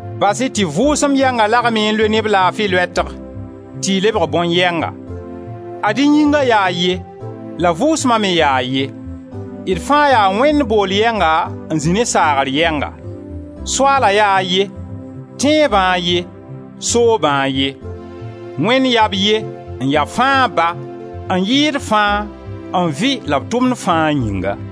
Bas-y tɩ Vʋʋsem yɛnga lagem-y n loe ne b laafi loɛtg tɩ y lebg bõn-yɛnga. Ad-y Yĩnga yaa a ye la Vʋʋsma me yaa a ye, d fãa yaa Wẽnd booll yɛnga n zĩ ne saagr yɛnga. Soaala yaa a ye, tẽebã a ye, soobã a ye. Wẽnd yaa b ye, n ya fãa Ba, n yɩɩd fãa, n vɩ la b tʋmd fãa yĩnga.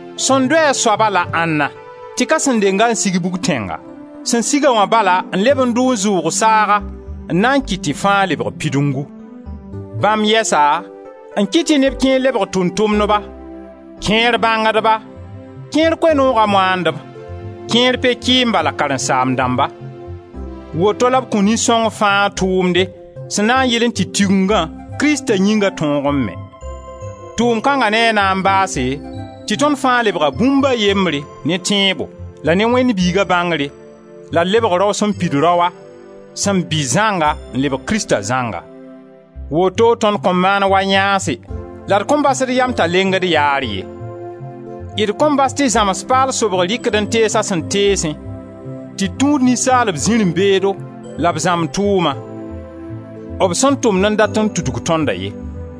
«Sẽn dʋ a soaba» la ãnna tɩ ka sẽn denga n sig bʋg-tẽnga? Sẽn siga wã bala n leb n dʋ n zʋʋg saaga n na n kɩt tɩ fãa lebg pidungu. Bãmb yɛsa n kɩt tɩ neb kẽer lebg tʋʋm-tʋmdba, kẽer bãngdba, kẽer Koe-nooga moandb, kẽer pe-kɩɩmba la karen-saamb dãmba. Woto la b kõ nin-sõng fãa a tʋʋmde sẽn na n yɩlẽ tɩ Tigengã, Krista Yĩnga, tõog n me. Tʋʋm kãnga ne a na n baase tɩ tõnd fãa lebga bũmb a yembre ne tẽebo la ne Wẽnd Biiga bãngre la d lebg Rao sẽn pid rao, sẽn bɩ zãnga, n lebg Krista zãnga. Woto tõnd kõn maan wa yãase la d kõn bas d yam t'a lengd yaar ye. D kõn bas tɩ zãms paal sobg rɩk-d n tees a sẽn teesẽ tɩ d tũud ninsaalb zirẽ-beedo la b zãmb tʋʋma b sẽn tʋmd n dat n tudg tõnda ye.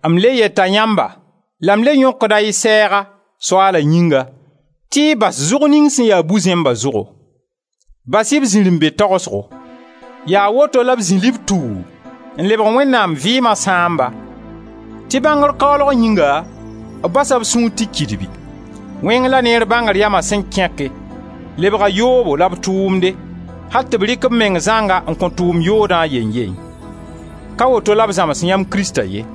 M le yeta yãmba la m le yõkda y sɛɛga, Soaala yĩnga, tɩ y bas zʋg ning sẽn ya bu-zẽmba zʋgo; bas-y b zirẽ-be-tagsgo; yaa woto la b zĩ lib-tuu n lebg Wẽnnaam vɩɩma sãamba, tɩ bãngr kaoolg yĩnga b basa b sũur tɩ kidibi. Wẽng la neer bãngr yama sẽn kẽke, lebga yoobo la b tʋʋmde, al tɩ b rɩk b meng zãnga n kõ tʋʋm yoodã, a yeyn-ye. Ka woto la b zãms yãmb Krista ye,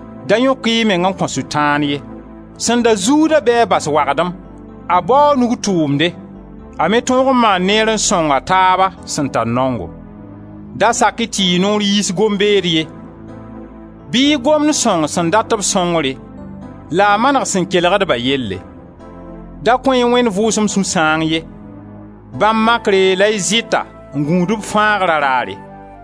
Da yõk-y y meng n kõ Sʋtãan ye. Sẽn da zuuda bɩ a bas wagdem, a bao a nug tʋʋmde, a me tõog n maan neere n sõng a taaba sẽn tar naongo! Da sak-y tɩ y noor yiis gom-beed ye; bɩ y gomd sõng sẽn dat-b sõngre, la a maneg sẽn kelgd-ba yelle. Da kõ-y Wẽnd Vʋʋsem sũ-sãang ye; bãmb makre la y zɩta n gũud b Fãagra raare.